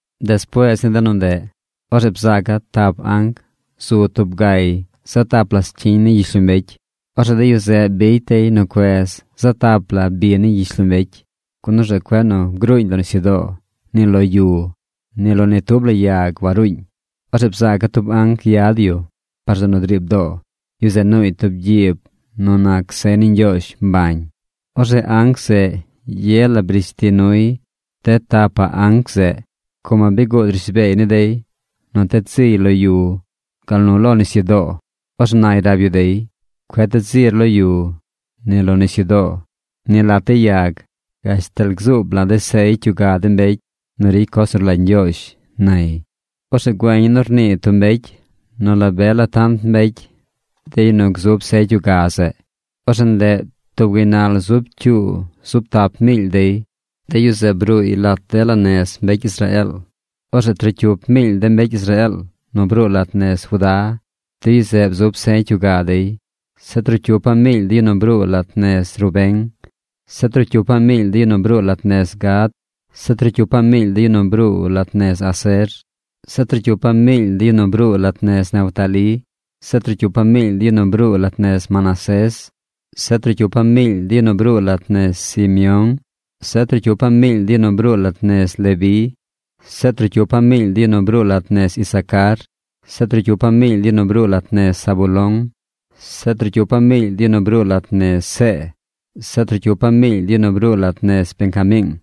Despuees ni de nu ndeꞌ, orzeꞌ bzaaca̱ tap anc zu tub gay zaꞌ tap la scyiñ ni gyishlombecy. Orzeꞌ de yu zeꞌ bicy dey nu cuez zaꞌ tap la bi ni gyishlombecy, gun orzeꞌ cueꞌ nu gruuñ lo nisyudoo, ni lo yu. Ni lo ni tub la yag waruuñ. Orzeꞌ bzaaca̱ tub anc yad yu par zeꞌ nu driib doo. Yu zeꞌ nuuy tub gyiib nu nac sey ni Ñgyoozh mbañ. Orzeꞌ anc zeꞌ ye la brish ti nuy de tap anc zeꞌ, como bi guud rishbeey ni dey nu ted ziy lo yu gal nu lo nisyudoo. Orzeꞌ nay rab yu dey: ―¡Cueꞌ ted zir lo yu, ni lo nisyudoo, ni lat de yag, gashtal gzuub la̱ de̱ sey cyuga de mbecy nu ricy coz nu rlagy Ñgyoozh! ―nay. Orzeꞌ güeña̱ nu rnii tub mbecy nu la be la tant mbecy de yu nu gzub sey cyuga zeꞌ. Orzeꞌ ndeꞌ tub gaynal zub cyuu zub tap miily dey. De yu zeꞌ bruuy lat dela nez mbecy Israeel. Orzeꞌ trocyup miily de mbecy Israeel nu bruu lat nez Judá, de yu zeꞌ bzub sey cyuga dey. Zeꞌ trocyupaꞌ miily de yu nu bruu lat nez Rubén. Zeꞌ trocyupaꞌ miily de yu nu bruu lat nez Gad. Zeꞌ trocyupaꞌ miily de yu nu bruu lat nez Aser. Zeꞌ trocyupaꞌ miily de yu nu bruu lat nez Neftalí. Zeꞌ trocyupaꞌ miily de yu nu bruu lat nez Manasés. Zeꞌ trocyupaꞌ miily de yu nu bruu lat nez Simeón. Zeꞌ trocyupaꞌ miily de yu nu bruu lat nez Leví. Zeꞌ trocyupaꞌ miily de yu nu bruu lat nez Isacar. Zeꞌ trocyupaꞌ miily de yu nu bruu lat nez Zabulón. Zeꞌ trocyupaꞌ miily de yu nu bruu lat nez See. Zeꞌ trocyupaꞌ miily de yu nu bruu lat nez Benjamiing.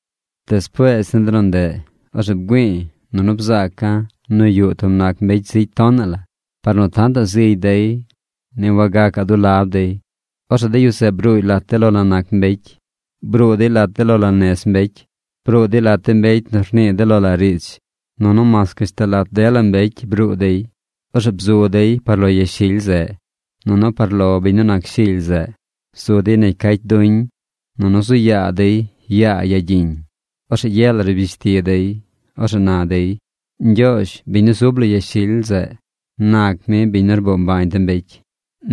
Despuees ni de nu ndeꞌ, orzeꞌ bgüi̱i̱, nunu bzaaca̱ nu yuꞌ tub nac mbecy zigy tonaꞌ la. Par nu tantaꞌ zigy dey, ni wagacaꞌ dulab dey. Orzeꞌ de yu zeꞌ bruuy lat de lo la nac mbecy. Bruu dey lat de lo la nez mbecy. Bruu dey lat de mbecy nu rnii de lo la riidz. Nunu mas gashtal lat dela mbecy bruu dey. Orzeꞌ bzu dey par lo yashily zeꞌ, nunu par lo biñ nu nac Shily zeꞌ. Zu dey negy cacy duñ, nunu zu yaa dey yaa yagyiñ. Orzeꞌ ye la rbish ti dey. Orzeꞌ na dey: ¡Ñgyoozh, biñ nu zub lo yashily zeꞌ, nac mi biñ nu rboo mbañ de mbecy!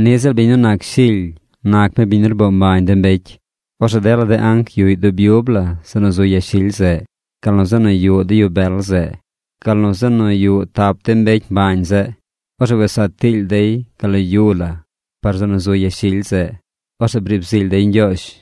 ¡Niꞌ ziꞌl biñ nu nac Shily nac mi biñ nu rboo mbañ de mbecy! Orzeꞌ dela de anc yuꞌy dub yub la zeꞌ nu zu yashily zeꞌ, gal nu zeꞌ nu yuꞌ de yu bel zeꞌ, gal nu zeꞌ nu yuꞌ tap de mbecy mbañ zeꞌ. Orzeꞌ wes saa tiily dey gal lo yu la par zeꞌ nu zu yashily zeꞌ. Orzeꞌ briib zily dey Ñgyoozh.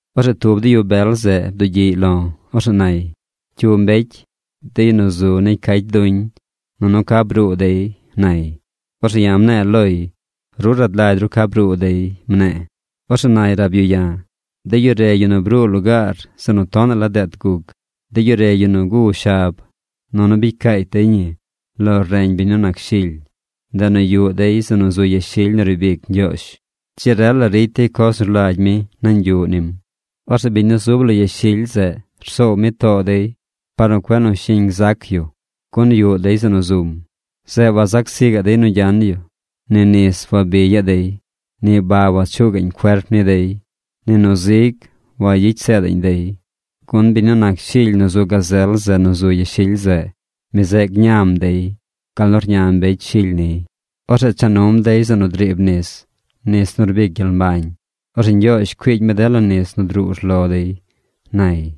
Orzeꞌ tub de yu bel zeꞌ bdugyiꞌy lo̱. Orzeꞌ nay: ―¿Cyu mbecy, de yu nu zu negy cacy duñ? ¿Nunu ca bruu dey? ―nay. Orzeꞌ ya̱ mne̱e̱ loy: ―Ru rad lagy ru ca bruu dey ―mne̱e̱. Orzeꞌ nay rab yu ya̱: ―De yu re yu nu bruu lugaar zeꞌ nu tonaꞌ la deet guc. De yu re yu nu gu shab, nunu bicy caacy dey ñi lo reñ biñ nu nac Shily. Ndeꞌ nu yuꞌ dey zeꞌ nu zu yashily nu riib ic Ñgyoozh. Dzi rel la ricy dey coz nu rlagy mi nañ yuꞌ nim. Orzeꞌ biñ nu zub lo yashily zeꞌ rsoow mi too dey par nu cueꞌ nu shiñ gzac yu, gun yuꞌ dey zeꞌ nu zum. Zeꞌ wazac zi gaꞌ dey nu gyan yu. Ni nis wabigyaꞌ dey. Ni ba wachuu gaꞌñ cuerp ni dey. Ni nu zig wayicy seedaꞌñ dey. Gun biñ nu nac Shily nu zu gazel zeꞌ nu zu yashily zeꞌ, mi zeꞌ gñam dey gal nu rña mbecy Shily niy. Orzeꞌ cha num dey zeꞌ nu driib nis, nis nu rbic gyel mbañ. Orzeꞌ Ñgyoozh cuiigy mi dela nis nu druu urlo dey ―nay.